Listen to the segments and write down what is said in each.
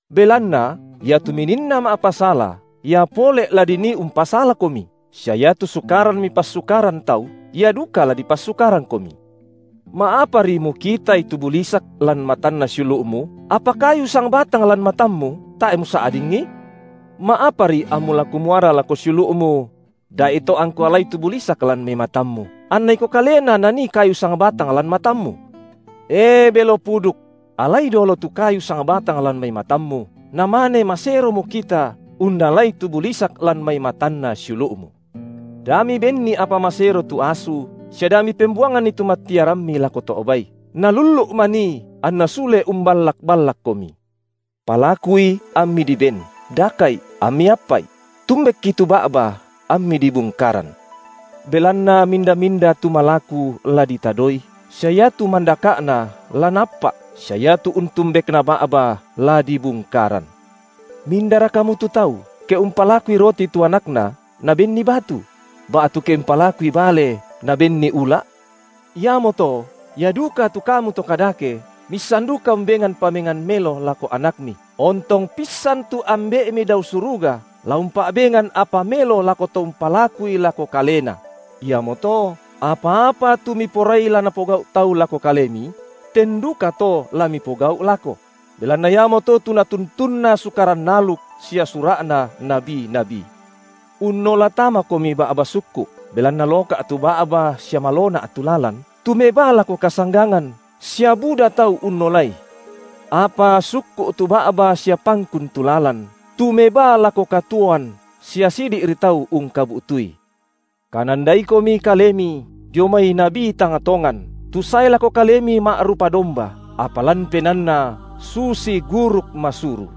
Belanna iatu mininna ma’pasala, ia pole’ la dinii umpasalakomi, sia iatu sukaran mipassukaran tau, ia duka la dipassukarangkomi. Ma’apari mukitai tu bulisak lan matanna siulu’mu, apa kayu sangbatang lan matammu tae’ musa’dingi? Ma’apari ammu la kumuara lako siulu’mu: Da’ito angku alai tu bulisak lan mai matammu, anna iko kalena nanii kayu sangbatang lan matammu? E belo puduk! Alai dolo tu kayu sangbatang lan mai matammu, namane masero mukita unnalai tu bulisak lan mai matanna siulu’mu. Da mibenni apa masero tu asu sia da mipembuanganni tu mattiarammi lako to’ bai, nalullu’ manii anna sule umballak-ballakkomi. Palakui, ammi diben, daka’i ammi appa’i; tumbekki tu ba’ba ammi dibungkaran. Belanna minda-minda tu malaku, la ditadoi, sia iatu mandaka’na, la naappa’, sia iatu untumbekna ba’ba, la dibungkaran. Mindara kamu tu tau, ke umpalakui roti tu anakna, nabenni batu? Ba’tu ke umpalakui bale, nabenni ula’? Iamoto, ia duka tu kamu to kadake miissan duka umbengan pamengan melo lako anakmi, ontong pissan tu Ambe’mi dao suruga la umpa’bengan apa melo lako to umpalakui lako Kalena? Iamoto apa-apa tu miporai la napogau’ tau lako kalemi, ten dukato la mipogau’ lako; belanna iamoto tu natuntunna Sukaran aluk sia sura’na nabi-nabi. Unnola tamakomi ba’ba sukku’, belanna loka’ tu ba’ba sia malona’ tu lalan, tu mebaa lako kasanggangan, sia buda tau unnolai. Apa sukku’ tu ba’ba sia pangkun tu lalan, tu mebaa lako katuoan, sia sidi’ri tau ungkabu’tui. Kanandaikomi kalemi dio mai nabi tang tongan, tu sae lako kalemi ma’rupa domba, apa lan penaanna susi guruk masuru.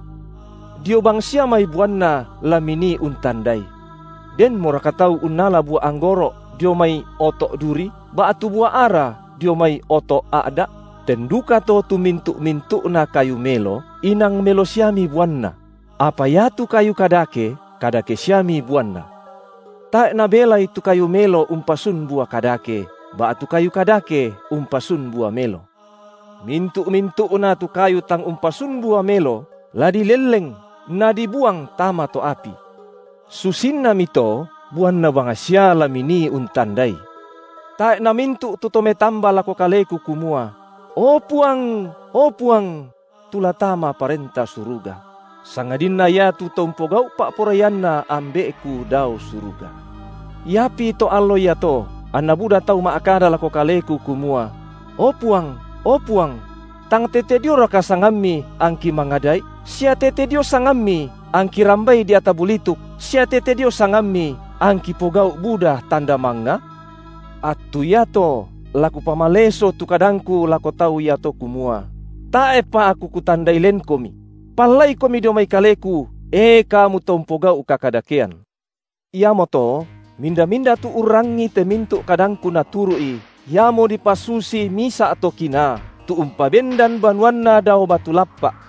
Dio bangsia mai buanna la minii untandai. Denmoraka tau unnala bua anggoro’ dio mai oto’ duri, ba’tu bua ara dio mai oto’ a’da’? Ten dukato tu mintu’-mintu’na kayu melo, inang melo siami buanna; apa iatu kayu kadake, kadake siami buanna. Tae’ nabelai tu kayu melo umpasun bua kadake, ba’tu kayu kadake umpasun bua melo. Mintu’-mintu’na tu kayu tang umpasun bua melo, la dilelleng nadibuang tama to’ api. Susinnamito buanna bangsia la minii untandai. Tae’ namintu’ tu to metamba lako Kaleku kumua: O Puang, o Puang! tu la tama Parenta Suruga; sangadinna iatu to umpogau’ pa’poraianNa Ambe’ku dao suruga. Iapi to allo iato anna buda tau ma’kada lako Kaleku kumua: O Puang, o Puang!, tang tete dioraka sangamMi angki mangada’i, sia tete dio sangamMi angki rambai deata bulituk sia tete dio sangamMi, angki pogau’ buda tanda mangnga? Attu iato la Kupamaleso tu kadangKu lako tau iato kumua: Tae’pa Aku Kutandai lenkomi; pallaikomi dio mai Kaleku, e kamu to umpogau’ kakadakean. Iamoto minda-minda tu urangii te mintu’ kadangKu naturu’i, iamo dipasusi misa’ to kinaa tu umpabendan banuanna dao batu lappa’,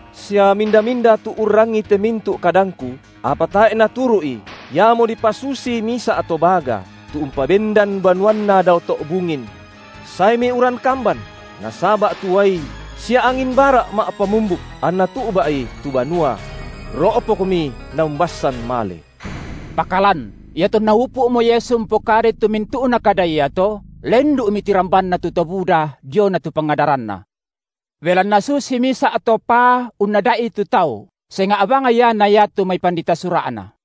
Sia minda-minda tu urrangii te mintu’ kadangKu, apa tae’ naturu’i, iamo dipasusi misa’ to baga, tu umpabendan banuanna dao to’ bungin; saemi uran kamban, nasaba’ tu uai sia angin bara’ ma’pamumbuk anna tu’ba’i tu banua: ro’pokmi naumbassan male. Pakalan iatonna upu’mo Yesu umpokadai tu mintu’na kada iato, lendu’mi tirambanna tu to buda diona tu pangadaranNa. Belanna susi misa’ to paa unnada’i tu tau, senga’ bang Ia na iatu mai pandita Sura’na.